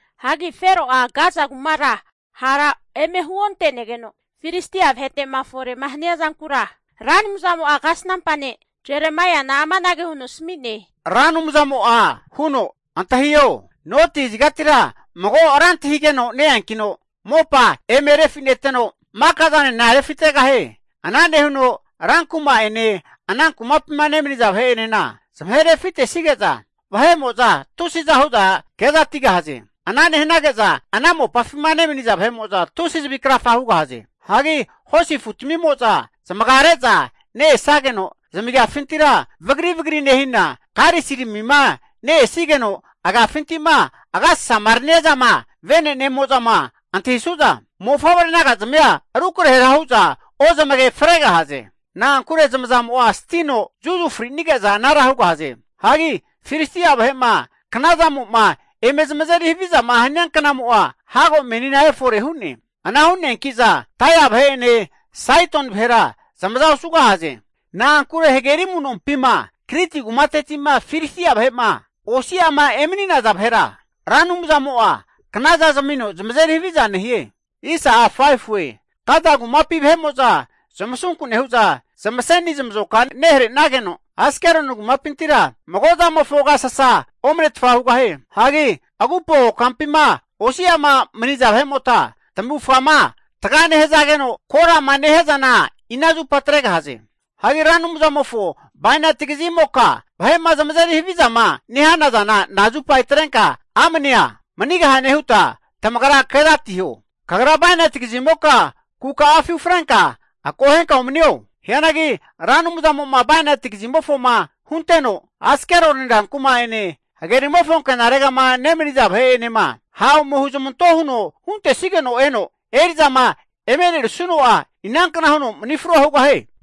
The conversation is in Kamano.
Hagi Fero'a Gaza kumara hara eme huonte'negeno, Filistia vahete'ma fore hania zankura Ra Anumzamo'a kasnampa ne' Jeremaiana amanage huno asami'ne. Ra Anumzamo'a huno, antahiho, noti kazigatira mago ranti hageno ne-eankino mopa eme refi'neteno, maka'zanena refitegahie. Ana nehuno rankuma'ene ana kumapima nemaniza vahe'enena zamahe refi'netesige'za, vahe'mo'za tusiza hu'za kezatigahaze. Ana nehanage'za ana mopafima nemaniza vahe'mo'za tusi zavi krafa hugahaze. Hagi hosi afutamimo'za zamagare'za ne-esageno, zamagiafintira vagri vagri nehina, karisiramima ne-esigeno agafinti'ma agasasama rania zama vene'nemo'zama antahisu'za, mofavre naga'zamia rukrahera hu'za ozamage fregahaze. Na'ankure zamazamo'a stino zuzufrinige'za anara hugahaze. Hagi Filistia vahe'ma knazamo'ma eme zamazeri havizama hania knamo'a hago meni efore hu'ne. Ana hu'neanki'za Tairi vahe'ene Saidoni vahera zamaza osugahaze. Na'ankure hageri amu'nompima Kriti kumateti'ma Filistia vahe'ma osi'ama emani'naza vahera, Ra Anumzamo'a knaza zamino zamazeri haviza nehie. Gaza kumapi vahe'mo'za zamasunku nehu'za zamaseni zamazoka nehare'nageno, Askeloni kumapintira mago zamofo agasasa omanetfa hugahie. Hagi agupo kokampima osi'ama maniza vahe'mota, tamavufgama taga nehazageno korama nehia zana ina zupa atregahaze? Hagi Ra Anumzamofo bainati kazimoka vahe'ma zamazeri havizama nehana zana nazupa atrenka amnea manigahane huta tamagra kezatiho. Kagra bainati kazimoka kuka'afi ufrenka, akohenka umanio. Hianagi Ra Anumzamo'ma bainati kazimofoma hunteno, Askeloni rankuma'ene hagerimofo ankenaregama nemaniza vahe'enema ha' ome huzamanto huno huntesigeno eno, eri'zama eme e'nerisuno'a, inankna huno mani frua hugahie?